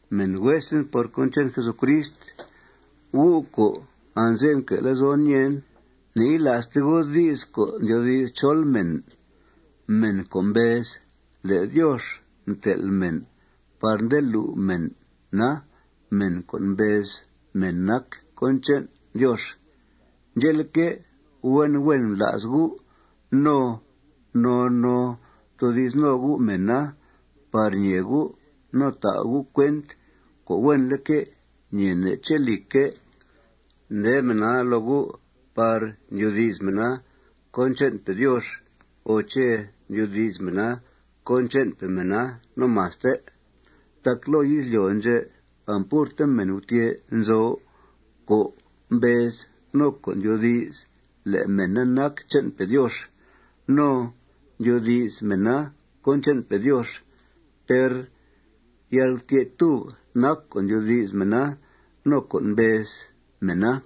Mèn huesen por cón che'n Jesucrist, gu' co' anze'f nque' lezon ñèen, ne'yila'ste gu' di's co' ndyoodi's chol mèn, mèn co' mbez le' Diox mtel' mèn par nde lu' mèna mèn co' mbez mèn nac cón che'n Diox. Ndxè'leque', huen huen bla's gu' no noo noo ftoodi's no gu' mèna par ñee gu' no ta' gu' cuent co' huenleque' ñeene' ché', lìcque', nde mèna loo gu' par ndyoodi's mèna cón che'npe Diox o ché' ndyoodi's mèna cón che'npe mèna no maste. Tac loo izlyo' ndxè' ampurte mèn gutyè' nzo co' mbez no co' ndyoodi's le' mèna nac che'npe' Diox no ndyoodi's mèna cón che'npe' Diox. Per yalgutyè'túb nac co' ndyoodi's mèna no co' mbez mèna.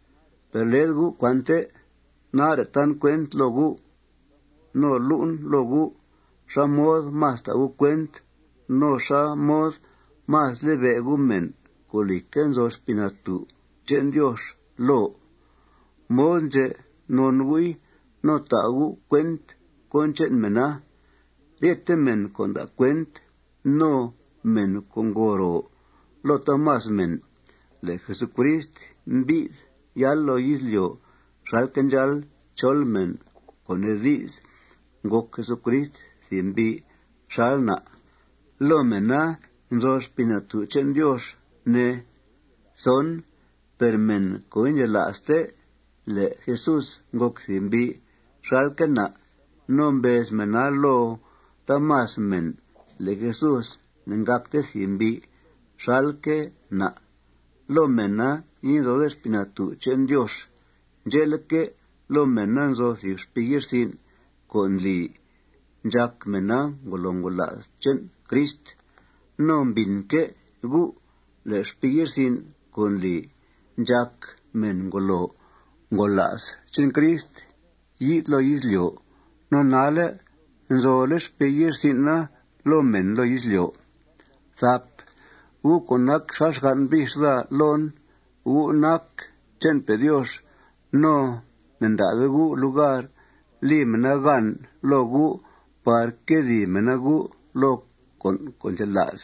Per led gu' cuante. Nare' tan cuent loo gu' no lu'en loo gu' xá mod más ta' gu' cuent no xá mod más libe' gu' mèn co', lìcque', nzo Xpii Natú' che'n Diox loo. Mod ndxè' non gu'i no ta' gu' cuent cón che'n mèna. Ryete mèn co' nda' cuent no mèn co' ngo ro loo taamas mèn le' Jesucrist mbi'th yáal loo izlyo' xalque' ndxáal chol mèn, co' nee di's, ngòc Jesucrist thìb mbi' xal na', loo mèna nzo Xpii Natú' che'n Diox, ne. Per mèn co' indxela'ste le' Jesús ngòc thìb mbi' xalque' na' no mbez mèna loo taamas mèn le' Jesús ne'ngàcte thìb mbi' xalque' na', loo mèna inzode Xpii Natú' che'n Diox. Ndxe'leque', loo mèna nzo thìb xpii ye'rsin' co' ndli ndxàc mèna ngolo ngola's che'n Crist. No mbìnque' gu' le' xpii ye'rsin' co' ndli ndxàc mèn ngolo ngola's che'n Crist yi'th loo izlyo'. No nalle' nzole' xpii ye'rsin'a loo mèn loo izlyo'. Gu' co' nac xal xgan' bix daa loon, gu' nac che'npe' Diox. No ne'nda'de gu' lugar li mèna gan loo gu' par nquedìi mèna gu' loo con' co' ndxela's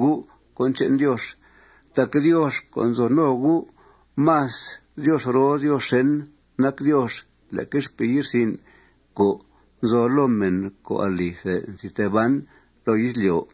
gu' cón che'n Diox. Tac Diox co' nzo no gu', más Diox roo Diox xèn nac Diox leque xpii ye'rsin' co' nzo loo mèn co' alithe nzi tee ban loo izlyo'.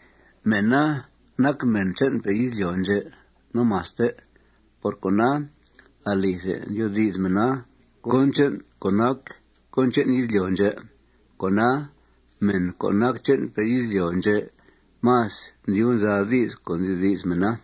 Mèna nac mèn che'npe' izlyo' ndxè' no maste. Por cona, alithe ndyoodi's mèna cón che'n co' nac cón che'n izlyo' ndxè'. Cona, mèn co' nac che'npe' izlyo' ndxè' más ndyub nza di's co' ndyoodi's mèna.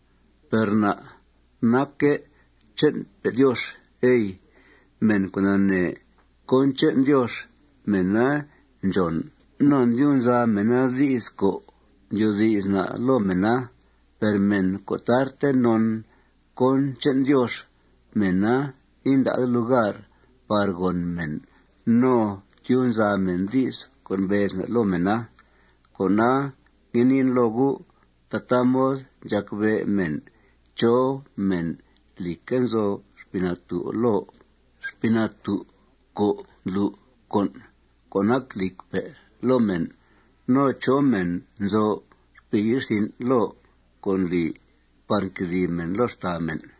Per na' nacque' che'npe' Diox, ey. Mèn co' nanee cón che'n Diox, mèna ndxòn no ndyub nza mèna di's co' ndyoodi's na' loo mèna. Per mèn co' tarte non cón che'n Diox, mèna inda'de lugar par gòn mèn no tyub nza mèn di's co' mbez na' loo mèna. Cona, ngue niin loo gu': Tataa mod ndxàc bé' mèn chó mèn, lìcque', nzo Xpii Natú' loo, Xpii Natú' co' ndlu' con' co' nac lìcpe' loo mèn, no chó mèn nzo xpii ye'rsin' loo co' ndli par nquedìi mèn loo xtàa mèn.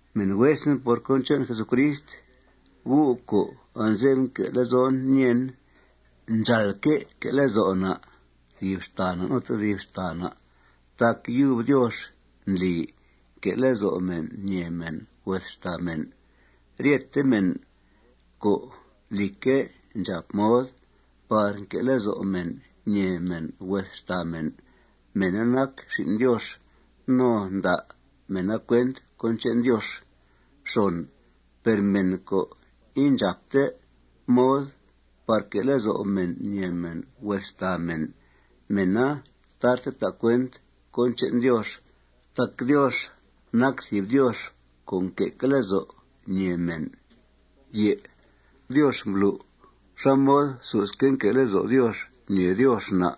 Mèn huesen por cón che'n Jesucrist, gu' co' anze'f nque' lezon ñèen, ndxàalque' que' lezo' na' thìb xtàa na' no tedib xtàa na' tac yub Diox ndli nque' lezo' mèn ñèe mèn hues xtàa mèn. Ryete mèn co', lìcque', ndxàp mod par nque' lezo' mèn ñèe mèn hues xtàa mèn, mèna nac xin' Diox no nda' mèna cuent cón che'n Diox. Per mèn co' indxàpte mod par que' lezo' mèn ñèe mèn hues xtàa mèn, mèna tarte ta' cuent cón che'n Diox. Tac Diox nac thìb Diox co' nque'que' lezo' ñèe mèn. Diox mblu' xá mod susque' nque' lezo' Diox ñèe Diox na'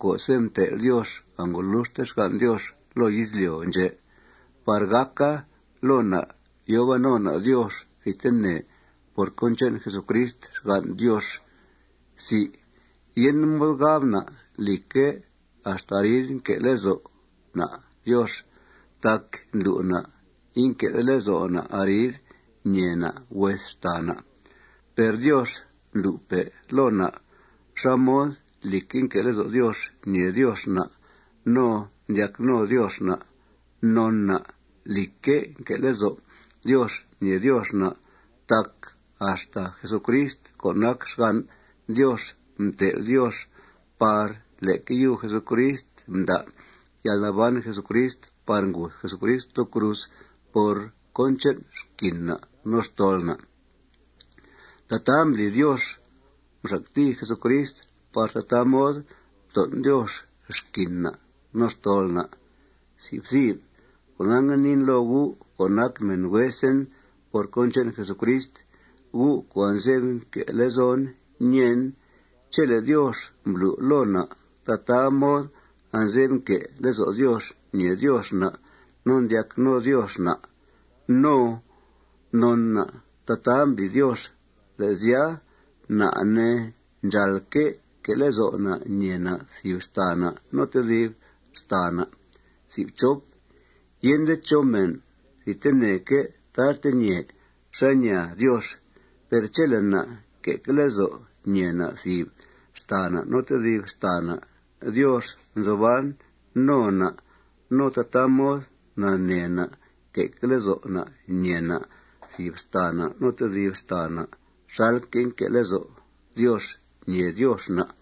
co'se' mtel' Diox angoluxte xgan' Diox loo izlyo' ndxè' par gàca loo na' yòo ban no na' Diox thidtene por cón che'n Jesucrist, xgan' Diox. Yende mod gab na', lìcque', axta arid nque' lezo' na' Diox tac ndlu' na' inque'de lezo' na' arid ñèe na' hues xtàa na'. Per Diox mblu'pe' loo na' xá mod, lìcque', nque' lezo' Diox ñèe Diox na' no ndyac no Diox na'. Non na', lìcque', nque' lezo' Diox ñèe Diox na' tac axta Jesucrist co' nac xgan' Diox mtel' Diox par leque yub Jesucrist mda' yalnaban Jesucrist par nguth Jesucrist loo cruz por cón che'n xquin na' no xtol na'. Tataa mbli Diox mxactìi Jesucrist par tataa mod mton' Diox xquin na' no xtol na'. Cona, ngue niin loo gu' co' nac mèn huesen por cón che'n Jesucrist, gu' co' anze'f nque' lezon nèen: Chele' Diox mblu' loo na' tataa mod anze'f nque' lezo' Diox ñèe Diox na' no ndyac no Diox na', no non na' tataa mbli Diox, le' sya, na', ne, ndxàalque' que' lezo' na' ñèe na' thìb xtàa na' no tedib xtàa na'. Yende chó mèn thidteneque' tarte ñèe xá ñaa Diox. Per chele' na' nque'que' lezo' ñèe na' thìb xtàa na' no tedib xtàa na', Diox nzo ban no na'. No tataa mod nanee na' nque'que' lezo' na' ñèe na' thìb xtàa na' no tedib xtàa na' xalque' nque' lezo' Diox ñèe Diox na'.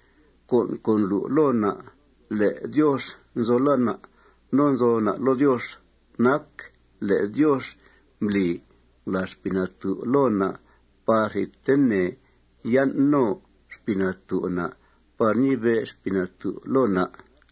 Con' co' ndlu' loo na' le' Diox nzo loo na' no nzo na' loo Diox nac le' Diox mbli ngulàa Xpii Natú' loo na' par thidtene yan' no Xpii Natú' na' par ñibe' Xpii Natú' loo na'.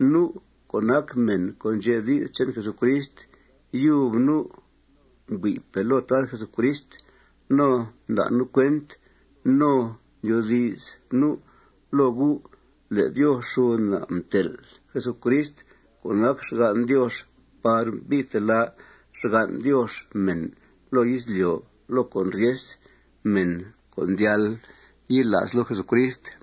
Nu' co' nac mèn co' ndxe' di's che'n Jesucrist, yub nu' mbui'pe' loo Tad Jesucrist. No nda' nu' cuent no ndyoodi's nu' loo gu' le' Diox xud na' mtel' Jesucrist co' nac xgan' Diox par mbi'th telá' xgan' Diox mèn loo izlyo' loo con' ryes, mèn co' ndyal yila's loo Jesucrist.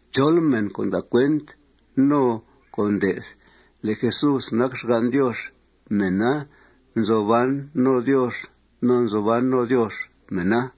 Chol mèn co' nda' cuent no co' nde'th le' Jesús nac xgan' Diox, mèna nzo ban no Diox no nzo ban no Diox mèna.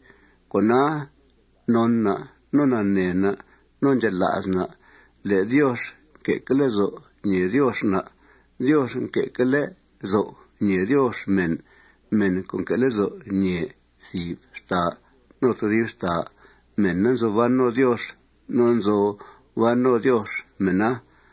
Cona, non na' no nanee na' no ndxela's na' le' Diox nque'que' lezo' ñèe Diox na'. Diox nque'que' lezo' ñèe Diox mèn. Mèn co' nque' lezo' ñèe thìb xtàa no tedib xtàa, mèna nzo ban no Diox no nzo ban no Diox mèna.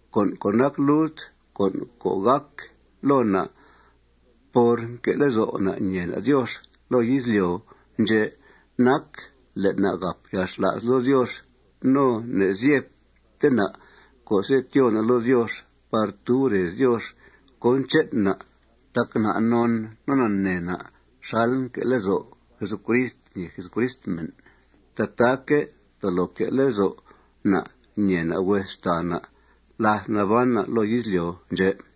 Con' co' nac lult con' co' gàc loo na' por nque' lezo' na' ñèe na' Diox loo izlyo' ndxè' nac le' na' gàp yalxla's loo Diox no ne'zyebte na' co'se' tyoo na' loo Diox par tub rez Diox cón che'n na'. Tac na' non no nanee na' xal nque' lezo' Jesucrist ñèe Jesucrist mèn, tataaque' tolo que' lezo' na' ñèe na' hues xtàa na' láth naban na' loo izlyo' ndxè'.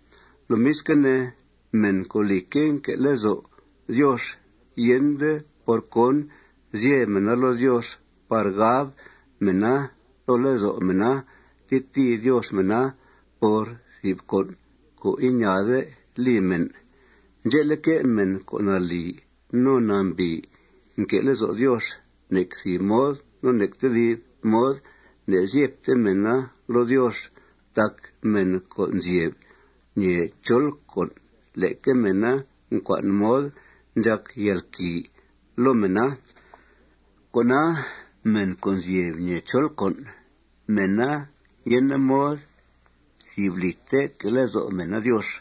Lomisque' ne, mèn co', lìcque', nque' lezo' Diox, yende por cón zyeb mèna loo Diox par gab mèna loo lezo' mèna tetìi Diox mèna por thìb con' co' iñaade li mèn. Ndxe'leque', mèn co' nalì no nambìi nque' lezo' Diox, nec thìb mod no nec tedib mod ne'zyebte mèna loo Diox. Tac mèn co' nzyeb ñèe chol con', leque mèna ncua'n mod ndxàc yalquìi loo mèna. Cona, mèn co' nzyeb ñèe chol con', mèna yende mod thìb lìte que' lezo' mèna Diox.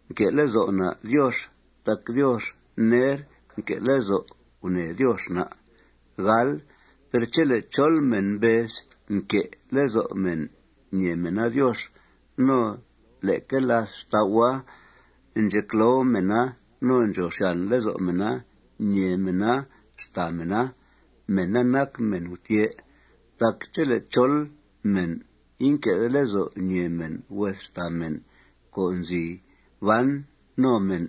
Nque' lezo' na' Diox tac Diox ner mque' lezo' gunèe Diox na'. Per chele' chol mèn mbez nque' lezo' mèn ñèe mèna Diox, no leque làth xtau'a, ndxecloo mèna no ndxòo xyàn lezo' mèna ñèe mèna xtàa mèna, mèna nac mèn gutyè'. Tac chele' chol mèn inque'de lezo' ñèe mèn hues xtàa mèn co' nzi ban no mèn,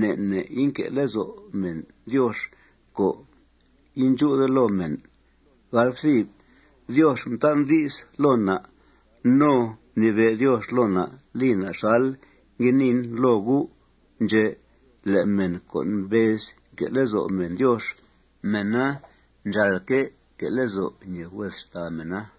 ne' ne' inque' lezo' mèn Diox co' indxú'de loo mèn. Diox mtan' di's loo na' no mnibe' Diox loo na' li na' xal ngue niin loo gu' ndxè' le' mèn co' mbez nque' lezo' mèn Diox, mèna ndxàalque' que' lezo' ñèe hues xtàa mèna.